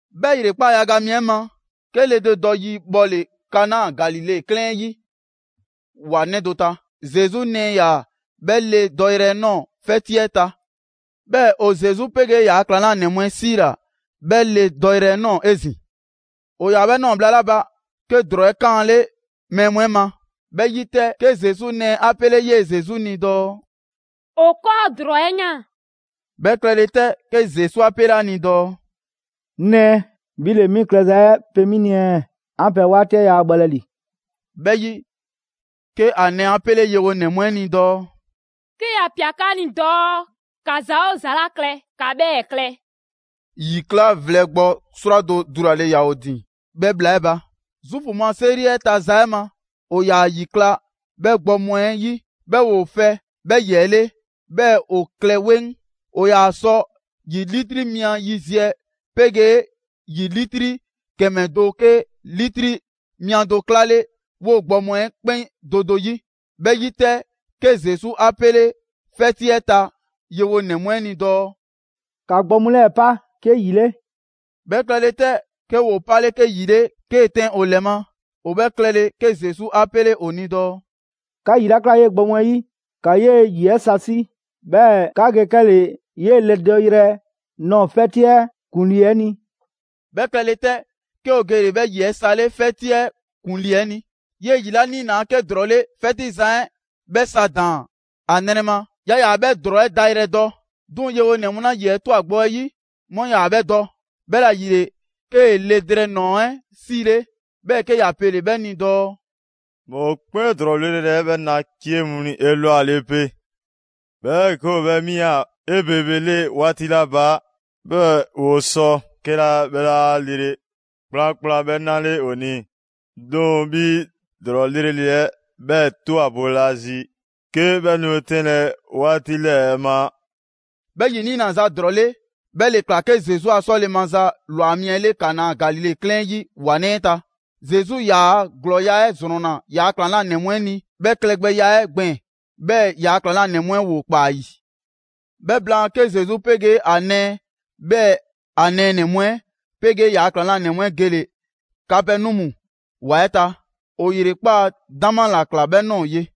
'Bhɛ ‑yrekpaa' yaga mi 'ɛ ma, 'ke le do dɔ yi bhɔle‑ Kana, Galile 'klɛɛn 'ɛ 'yi ‑wa 'nɛ do ta. Zesu nɛɛ ‑yaa 'bhɛ le dɔyrɛ nɔɔ‑ 'fɛti 'ɛ ta. 'Bhɛɛ‑ ‑o Zesu 'pegee ‑yaa' ‑klaŋlanɛ mu 'ɛ 'siila‑ 'bhɛ le dɔyrɛ 'ɛ ꞊nɔɔ 'ezin‑. ‑O ‑yaa 'bhɛ ꞊nɔɔ bhla 'la ba, 'ke ‑drɔɔ 'ɛ 'kaanle mɛɛ mu 'ɛ ma. 'Bhɛ 'yi 'tɛ, 'ke Zesu nɛɛ 'a 'pele 'yee‑ Zesu ni dɔɔ: «‑O 'kɔɔ ‑drɔɔ 'ɛ ꞊yaan.» 'Bhɛ klɛle 'tɛ, 'ke Zesu 'a 'pele 'a ni dɔɔ: «'Ŋ nɛɛ, 'bhi ‑le 'mi klɛza 'ɛ pe 'mi ni ɛɛ? 'An pɛ 'waati 'ɛ yaa bhɔlɛ ‑li.» 'Bhɛ 'yi, 'ke ‑a nɛɛ 'a 'pele yewonɛ mu 'ɛ ni dɔɔ: «'Ke ‑ya ꞊pia 'ka ni dɔɔ 'ka ‑za 'oo ‑za 'la klɛ, ‑ka 'bhɛɛ‑ klɛ.» ‑Yi 'kla vlɛ gbɔ 'srwado‑ dulale ‑yaa ‑o ‑din 'bhɛ bhla 'ɛ ba. Zuufu mu 'a 'seri 'ɛ ta za 'ɛ ma, ‑o ‑yaa ‑yi ꞊kla 'bhɛ gbɔ mu 'ɛ 'yi, 'bhɛɛ‑ ‑woo 'fɛ 'bhɛ ‑yi 'ɛ 'le, 'bhɛɛ‑ ‑o klɛ 'weŋ. ‑O ‑yaa sɔ ‑yi 'litri mia yiziɛ 'pegee ‑yi 'litri ‑kɛmɛ do 'ke 'litri mia do 'klale 'woo‑ gbɔ mu 'ɛ 'kpɛn do do 'yi. 'Bhɛ 'yi 'tɛ, 'ke Zesu 'a 'pele 'fɛti 'ɛ ta yewonɛ mu 'ɛ ni dɔɔ: «‑Ka gbɔ mu 'lɛɛ‑ pa 'ke ‑yi 'le.» 'Bhɛ klɛle 'tɛ, 'ke ‑woo 'pale 'ke ‑yi 'le 'kee‑ tɛn ‑o ‑lɛ ma. ‑O bhɛ klɛle, 'ke Zesu 'a 'pele ‑o ni dɔɔ: «'Ka ‑yi 'la ꞊klaa 'yee‑ gbɔ mu 'ɛ 'yi, ‑ka 'yee‑ ‑yi 'ɛ sa 'si, 'bhɛɛ‑ 'ka ge 'kɛle‑ 'yee‑ le dɔyrɛ nɔɔ‑ 'fɛti 'ɛ ‑kuŋlii 'ɛ ni.» 'Bhɛ klɛle 'tɛ, 'ke ‑o gele‑ 'bhɛ ‑yi 'ɛ sa 'le 'fɛti 'ɛ ‑kuŋlii 'ɛ ni. 'Yee‑ ‑yi 'la 'niinaa‑ 'ke ‑drɔɔ 'le, 'fɛti zan 'ɛ 'bhɛ sa ‑daan ‑a nrɛ ma. Yaa ‑yaa 'bhɛ ‑drɔɔ 'ɛ dayrɛ dɔ. 'Duŋ‑ yewonɛ mu 'la ‑yi 'ɛ ꞊twa gbɔ 'ɛ 'yi, 'mu 'yaa‑ 'bhɛ dɔ. 'Bhɛla‑ ‑yile, 'kee‑ le drɛɛ ‑nɔɔ 'ɛ 'siile. 'Bhɛɛ‑ 'ke ‑ya pele‑ 'bhɛ ni dɔɔ: «Mɔkpɛn' ‑drɔɔ 'lrele‑ 'ɛ 'bhɛɛ‑ na 'cie mu 'ɛ ni 'elwale 'pe, 'bhɛɛ‑ 'ke ‑o 'bhɛ 'mia‑ 'ebebele 'waati 'la ba, 'bhɛɛ‑ ‑o sɔ 'kɛla 'bhɛ 'laa lele kplankplan 'bhɛ 'nale ‑o ni. 'Duŋ‑, 'bhi ‑drɔɔ 'lrele‑ 'ɛ 'bhɛɛ‑ ꞊twa boolazi, 'ke 'bhɛ nu 'tɛnlɛ‑ 'waati 'lɛɛ‑ ma!» 'Bhɛ ‑yi 'niinaza 'ɛ ‑drɔɔ 'le, 'bhɛ ‑le ꞊kla 'ke Zesu a 'sɔle‑ maza ‑lwa mi 'ɛ 'le Kana, Galile 'klɛɛn 'yi ‑wa 'nɛ 'ɛ ta. Zesu ‑yaa' 'glɔɔya‑ 'ɛ ‑zrɔnna ‑yaa' ‑klaŋlanɛ mu 'ɛ ni 'bhɛɛ‑ klɛgbɛya 'ɛ gbɛɛn‑. 'Bhɛɛ‑ ‑yaa' ‑klaŋlanɛ mu 'ɛ ‑woo ‑kpaa ‑a ‑yi. 'Bhɛ blaan, 'ke Zesu 'pegee ‑a nɛɛ, 'bhɛɛ‑ ‑a nɛɛnɛ‑ mu 'ɛ 'pegee ‑yaa' ‑klaŋlanɛ mu 'ɛ gele‑ Kapɛnɔmu ‑wa 'ɛ ta. ‑O ‑yrekpaa' 'dama ‑la ‑kla 'bhɛ ꞊nɔɔ ye.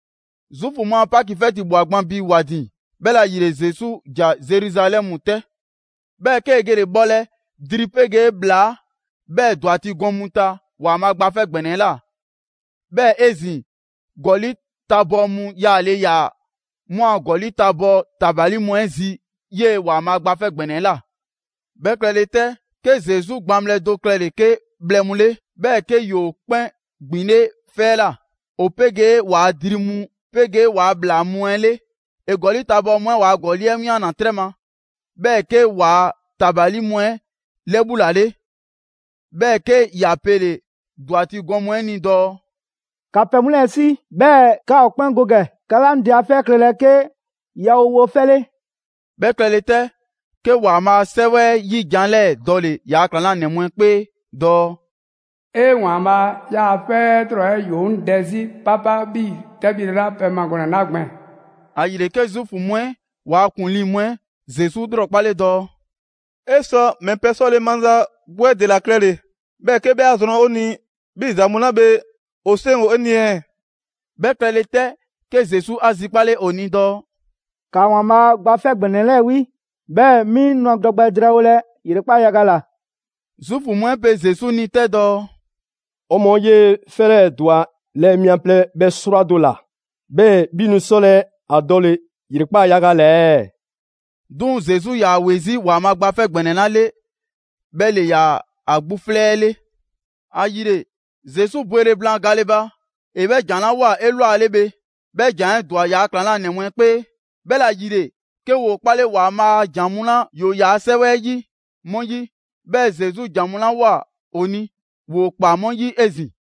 Zuufu mu a Paki 'fɛti ꞊bhwa gban bi ‑wa ‑din, 'bhɛla‑ ‑yile, Zesu ‑ja Zeruzalɛmu 'tɛ. 'Bhɛɛ‑ 'kee‑ gele‑ bhɔlɛ dri 'pegee ‑bhlaa, 'bhɛɛ‑ ‑dwati' gɔn mu ta ‑Waanbhaa' Gba 'Fɛ ‑Gbɛnɛ 'ɛ ꞊la. 'Bhɛɛ‑ 'ezin‑, ‑gɔli' tabɔɔ mu yaale ‑yaa 'mu a ‑gɔli' tabɔɔ ‑tabali mu 'ɛ zi 'yee‑ ‑Waanbhaa' Gba 'Fɛ ‑Gbɛnɛ 'ɛ ꞊la. 'Bhɛ klɛle 'tɛ, 'ke Zesu gbaŋbhlɛ do klɛle‑ 'ke bhlɛ mu 'le, 'bhɛɛ‑ 'ke ‑yoo 'kpɛn ‑gbinle' 'fɛ 'ɛ ꞊la, ‑o 'pegee ‑waa dri mu 'pegee ‑waa' ‑bhlaa mu 'ɛ 'le. ‑E ‑gɔli' tabɔɔ mu 'ɛ waa ‑gɔli' 'ɛ 'wianna‑ 'trɛ ma, 'bhɛɛ‑ 'kee‑ waa ‑tabali mu 'ɛ 'lɛbhulale. 'Bhɛɛ‑ 'ke ‑ya pele‑ ‑dwati' gɔn mu 'ɛ ni dɔɔ: «‑Ka pɛ mu 'lɛɛ‑ 'si, 'bhɛɛ‑ 'ka ‑o 'kpɛn go ‑gɛ! 'Ka 'laa 'ŋ Dɛ a 'fɛ 'ɛ klɛlɛ 'ke yawowofɛ 'le!» 'Bhɛ klɛle 'tɛ, 'ke ‑Waanbhaa' a 'Sɛwɛ 'ɛ 'yi ‑jan 'lɛɛ‑ dɔle‑ ‑yaa' ‑klaŋlanɛ mu 'ɛ 'kpee dɔɔ: «'E! ‑Waanbhaa', 'yaa‑ 'fɛ 'ɛ 'lrɔ‑ 'ɛ ‑yoo 'ŋ dɛ 'zi 'papa 'bhii‑ 'tɛbhile la pɛ ma gɔnɛ‑ 'la gbɛɛn‑.» ‑Ayile, 'ke Zuufu mu 'ɛ ‑waa' ‑kuŋlii mu 'ɛ Zesu 'lrɔkpale dɔɔ: «'E sɔ ‑mɛ pɛ 'sɔle‑ maza 'gbu 'ɛ ‑dela klɛle, 'bhɛɛ‑ 'ke 'bhɛ 'a zrɔn 'o ni 'bhii‑ ‑za mu 'la bhe ‑o 'seŋ ‑o 'e ni ɛɛ?» 'Bhɛ klɛle 'tɛ, 'ke Zesu 'a zikpale ‑o ni dɔɔ: «‑Ka ‑Waanbhaa' Gba ‑Gbɛnɛ 'Fɛ 'lɛɛ‑ 'wi, 'bhɛɛ‑ 'mi nu ‑a dɔ gbɛ drɛɛwolɛ ‑yrekpaa' yaga ꞊la.» Zuufu mu 'ɛ pe Zesu ni 'tɛ dɔɔ: «'O mɔɔ 'yee‑ 'fɛ 'lɛɛ‑ ‑dwa lɛɛ mia plɛ bhɛ 'srwado‑ ‑la, 'bhɛɛ‑ 'bhi nu 'sɔlɛ‑ ‑a dɔle‑ ‑yrekpaa' yaga ꞊la ɛɛ?» 'Duŋ‑ Zesu 'yaa‑ ‑we 'zi ‑Waanbhaa' Gba 'Fɛ ‑Gbɛnɛ 'la 'le, 'bhɛ ‑le ‑yaa ‑a 'gbu 'flɛ 'ɛ 'le. ‑Ayile, Zesu bwele blaan gale ba, ‑e 'bhɛ ‑jan 'la ꞊woa 'elwale bhe, 'bhɛ ‑jan 'ɛ ‑dwa ‑yaa' ‑klaŋlanɛ mu 'ɛ 'kpee. 'Bhɛla‑ ‑yile, 'ke ‑woo 'kpale ‑Waanbhaa' a ‑jan mu 'la ‑yoo ‑yaa' 'Sɛwɛ 'ɛ 'yi 'mu 'yi. 'Bhɛɛ‑ Zesu ‑jan mu 'la ꞊woa ‑o ni, ‑woo ꞊kpaa 'mu 'yi 'ezin‑.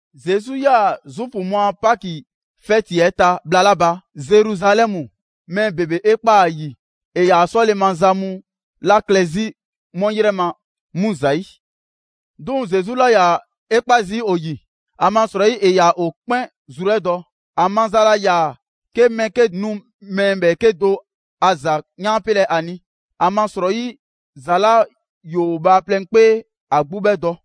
Zesu 'yaa‑ Zuufu mu a Paki 'fɛti 'ɛ ta bhla 'la ba Zeruzalɛmu, mɛɛ ‑bebe 'e ꞊kpaa ‑a ‑yi ‑e ‑yaa 'sɔle‑ maza mu 'la klɛ 'zi 'mu 'yrɛ ma 'mu ‑zayi'. 'Duŋ‑ Zesu 'laa ‑yaa 'e 'kpa zii' ‑o ‑yi, ‑amasrɔyi ‑e ‑yaa ‑o 'kpɛn zru 'ɛ dɔ. ‑A maza laa ‑yaa 'ke mɛɛ 'ke nu mɛɛ ‑bhɛɛke' do a ‑za 'yaanpelɛ ‑a ni. ‑Amasrɔyi, ‑za 'la ‑yoo bhaaplɛŋ 'kpee, ‑a 'gbu 'bhɛ dɔ.